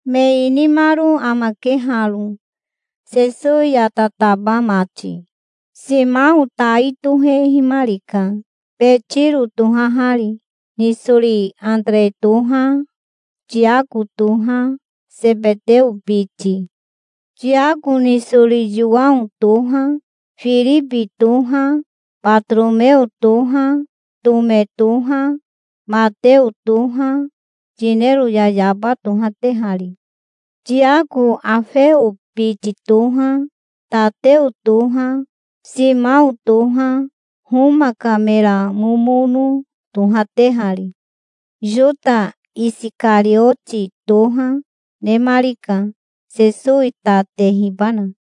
Me inimaro amake haro, Sesowi ya tataba mati. Simao tai tohehimarika, Betiro tohahari. Nisori Atere toha, Tiako toha, Sebeteo biti. Tiako nisori Yowao toha, Firibi toha, Batoromeo toha, Tome toha, Mateo toha, yinero yayaba tohatehari. Tiako Afeo biti toha, Tateo toha, Simao toha, Homa ka mera momono tohatehari. Yota Isikarioti toha, nemarika, Sesowi ta tehibana.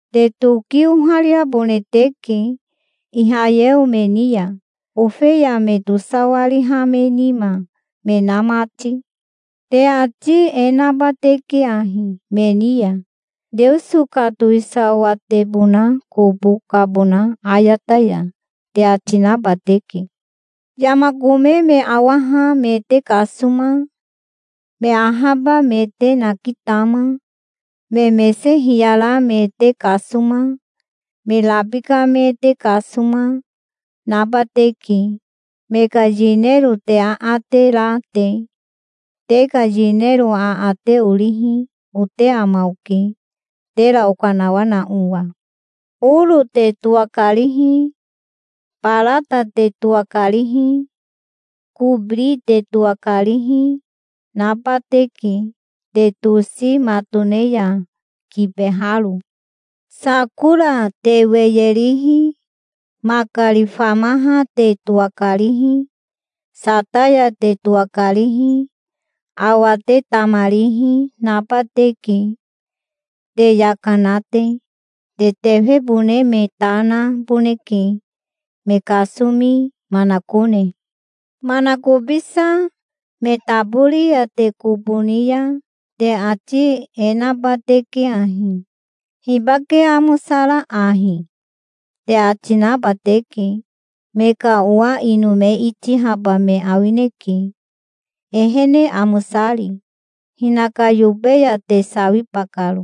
Te toki ohariabone teke Ihayeo me ni ya, ofeya me tosawariha me nima me na mati. Te ati e naba teke ahi me ni ya: 'Teoso ka towisawatebona kobo kabona ayata ya', te ati naba teke. Yama kome me awaha me te kasoma, me ahaba me te nakitama, me mese hiyara me te kasoma, me rabika me te kasoma, naba teke, me ka yinero te aate ra te. Te ka yinero aate orihi ote ama oke, tera okanawana owa. Oro te towakarihi, barata te towakarihi, kobiri te towakarihi, naba teke te tosi matone ya kibeharo. Sakora te weye rihi, makari famaha te towakarihi, sataya te towakarihi, awa te tamarihi naba teke, te yaka na te. Te tefebone me ta naboneke, me kasomi manakone. Manakobisa me tabori ya te kobo ni ya te ati e naba teke ahi: 'Hibake amosara ahi?' te ati naba teke. Me ka owa ino me itihaba me awineke, ehene amosari, hinaka yobe ya te sawiba karo.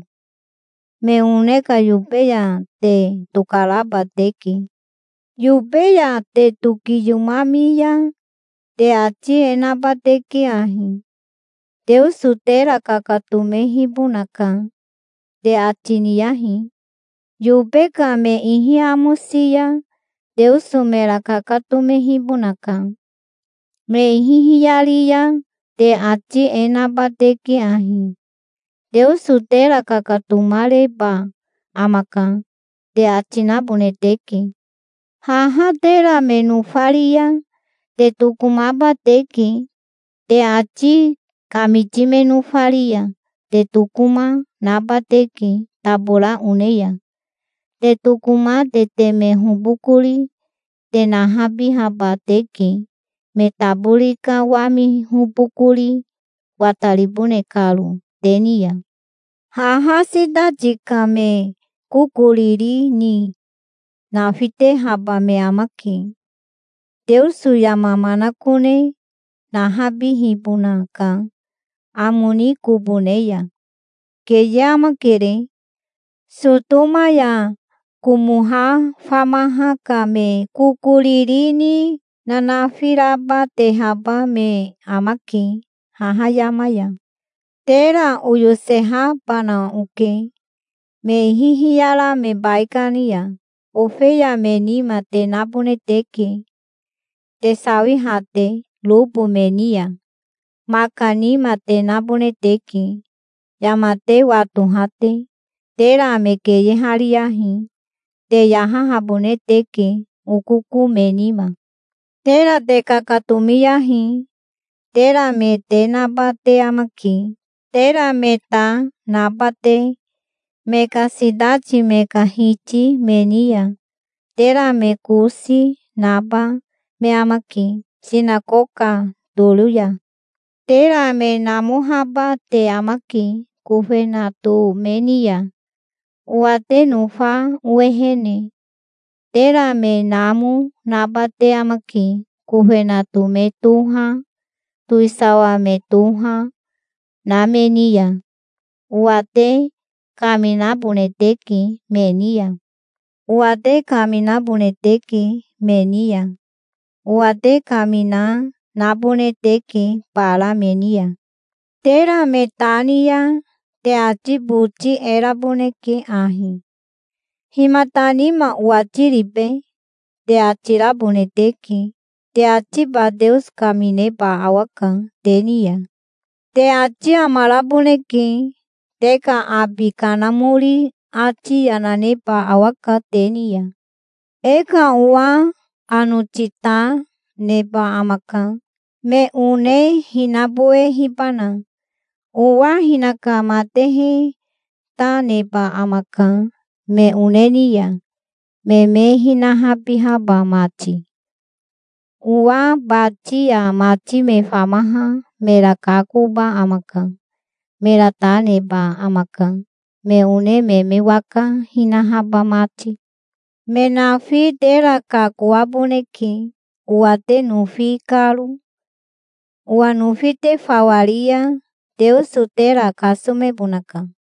Me one ka yobe ya te tokaraba teke. Yobe ya te tokiyomami ya te ati e naba teke ahi: 'Teoso tera kakatomehibonaka', te ati niyahi. Yobe ka me ihi amosi ya Teoso mera kakatomehibonaka. Me ihi hiyari ya te ati e naba teke ahi: 'Teoso tera kakatomareba amaka', te ati nabone teke. Haha tera me nofari ya te tokomaba teke. Te ati kamiti me nofari ya te tokoma, naba teke tabora one ya. Te tokoma te teme hobokori te nahabihaba teke, me tabori ka wami hobokori wataribone karo te ni ya. Haha sitati ka me kokoriri ni nafitehaba me amake, Teoso yama manakone nahabihibona ka amo ni kobo ne ya. Keye amakere. Sotoma ya Komoha famaha ka me kokoriri ni nanafi raba tehaba me amake haha yama ya". "Tera oyosehabana oke me ihi hiyara me baikani ya. Ofeya me nima te nabone teke, te sawiha te robo me ni ya. Maka nima te nabone teke, yama te watoha te. Tera me keyehariyahi. Te yahahabone teke, okoko me nima. Tera te kakatomiyahi. Tera me te naba te amake, tera me ta naba te, me ka sitati me ka hiti me ni ya. Tera me kosi naba me amake sinakoka toro ya. Tera me namohaba te amake kofenato me ni ya, owa te nofa owehene. Tera me namo naba te amake, kofenato me toha, towisawa me toha, na me ni ya. Owa te kaminabone teke me ni ya. Owa te kaminabone teke me ni ya. Owa te kamina nabone teke bara me ni ya. Tera me ta ni ya te ati boti e raboneke ahi: 'Himata nima owati ribe?' te ati rabone teke. Te atiba Teoso kamineba awaka te ni ya. Te ati amaraboneke. Te ka abi Kanamori ati yana neba awaka te ni ya". "E ka owa anoti ta neba amaka, me one hinabowehibana. Owa hinaka matehe ta neba amaka me one ni ya, me me hinahabihaba mati. Owa bati ya mati me famaha mera kakoba amaka. Mera ta neba amaka, me one me me waka hinahaba mati. Me nafi tera kakoaboneke, owa te nofi karo. Owa nofi te fawa ri ya Teoso tera kasomebonaka.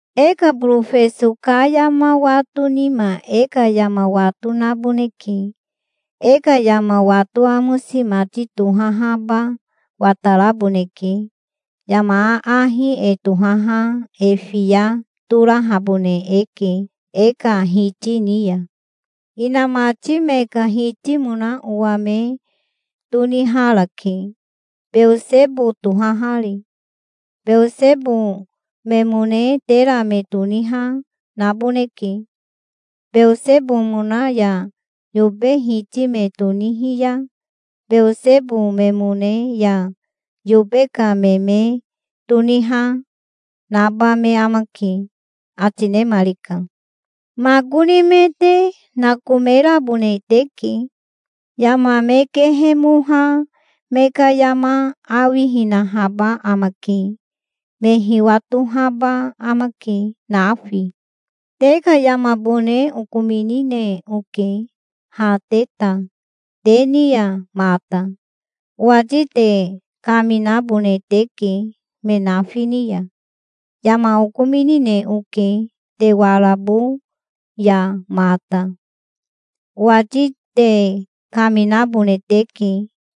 "E ka borofeso ka yama wato nima e ka yama wato naboneke. E ka yama wato amosi mati tohahaba wataraboneke. Yama aahi e tohaha e fiya torahabone eke e ka hiti ni ya. Inamati me ka hitimona owa me toniharake, Beosebo tohahari. Beosebo memone tera me toniha naboneke. Beosebomona ya yobe hiti me tonihi ya Beosebo memone ya yobe ka me me toniha, naba me amake", ati nemarika. "Makoni me te nakomerabone teke. Yama me kehemoha me ka yama awihinahaba amake. Me hiwatohaba amake nafi. Te ka yamabone okominine oke ha te ta te ni ya mata. Owati te kaminabone teke me nafi ni ya. Yama okominine oke te warabo ya mata. Owati te kaminabone teke,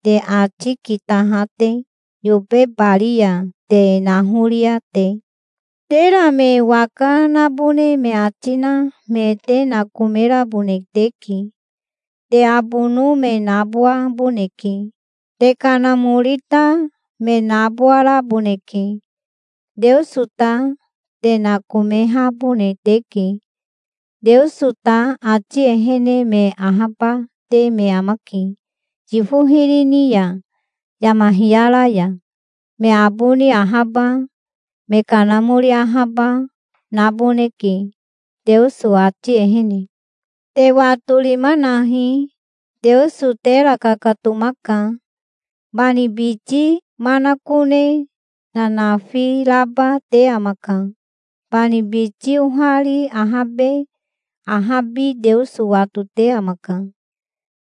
te ati kitaha te, yobe bari ya te nahoria te. Tera me waka nabone me ati na me te nakomerabone teke. Te abono me nabowaboneke. Te kanamori ta me nabowaraboneke. Teoso ta te nakomehabone teke. Teoso ta ati ehene me ahabate me amake yifo hiri ni ya yama hiyara ya. Me aboni ahaba me kanamori ahaba naboneke Teoso ati ehene. Te watorima nahi. Teoso tera kakatomaka. Bani biti manakone nanafi raba te amaka. Bani biti ohari ahabe ahabi Teoso watote amaka.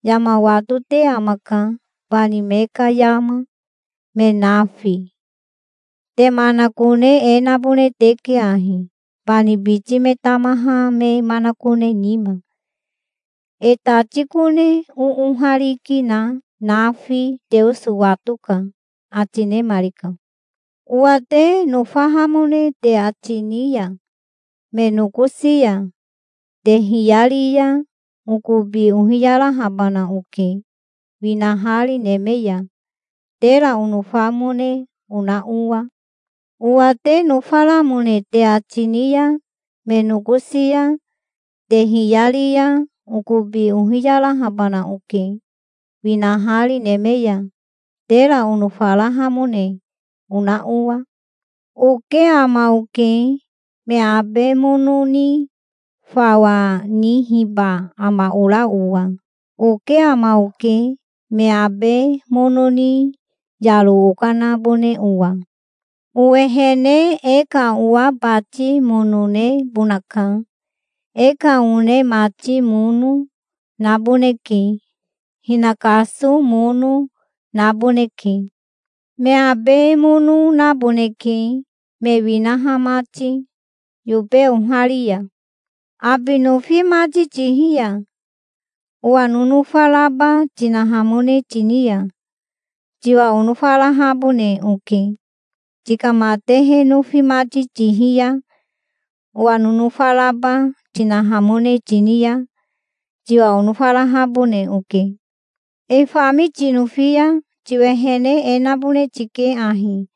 Yama watote amaka, bani me ka yama, me nafi. Te manakone e nabone teke ahi, bani biti me tamaha me manakone nima. E tati kone oohariki na nafi Teoso watoka", ati nemarika. "Owa te nofahamone te ati ni ya me nokosi ya te hiyari ya, okobi ohiyarahabana oke winahari neme ya, tera onofamone ona owa. Owa te nofaramone te ati ni ya me nokosi ya te hiyari ya, okobi ohiyarahabana oke winahari neme ya, tera onofarahamone ona owa". "Oke ama oke, me abe mono ni fawa nihiba ama ora owa. Oke ama oke me abe mono ni yaro okanabone owa. Owehene e ka owa bati mono nebonaka. E ka one mati mono, naboneke. Hinakaso mono, naboneke. Me abe mono naboneke, me winaha mati yobe ohari ya. Abi nofi mati tihi ya owa nonofa raba tinahamone tini ya, tiwa onofarahabone oke. Tika matehe nofi mati tihi ya owa nonofa raba tinahamone tini ya tiwa onofarahabone oke. E fami tinofi ya tiwehene e nabone tike ahi: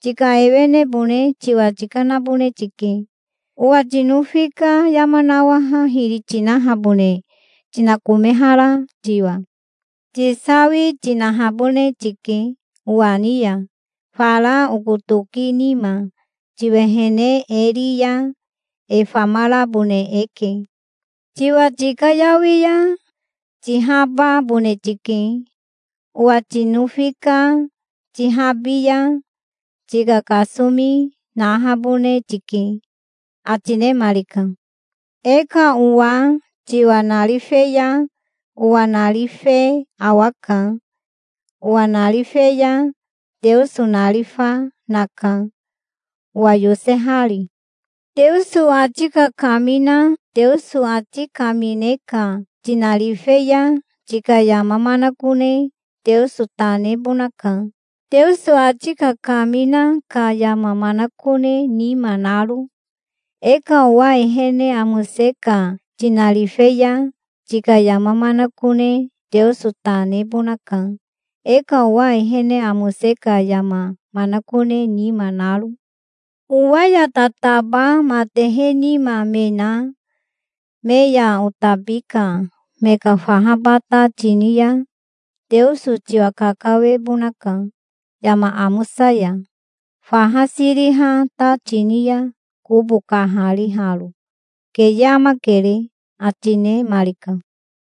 tika ewenebone tiwa tikanabone tike, owa tinofi ka yama nawaha hiri tinahabone tinakomehara tiwa. Tisawi tinahabone tike owa ni ya fara oko toki nima. Tiwehene e ri ya e famarabone eke. Tiwa tikayawi ya tihababone tike. Owa tinofi ka tihabi ya tika kasomi nahabone tike", ati nemarika. "E ka owa tiwa narife ya owa narife awaka. Owa narife ya Teoso narifa naka, owa yosehari. Teoso ati kakamina Teoso ati kamine ka tinarife ya tika yama manakone Teoso ta nebonaka, Teoso ati kakamina ka yama manakone nima naro. E ka owa ehene amose ka tinarife ya, tika yama manakone Teoso ta nebonaka, e ka owa ehene amose ka yama manakone nima naro. Owa ya tataba matehe nima me na me ya otabi ka me ka fahaba ta tini ya, Teoso tiwa kakawebonaka, yama amosa ya, faha siriha ta tini ya kobo kahariharo. Keye amakere", ati nemarika.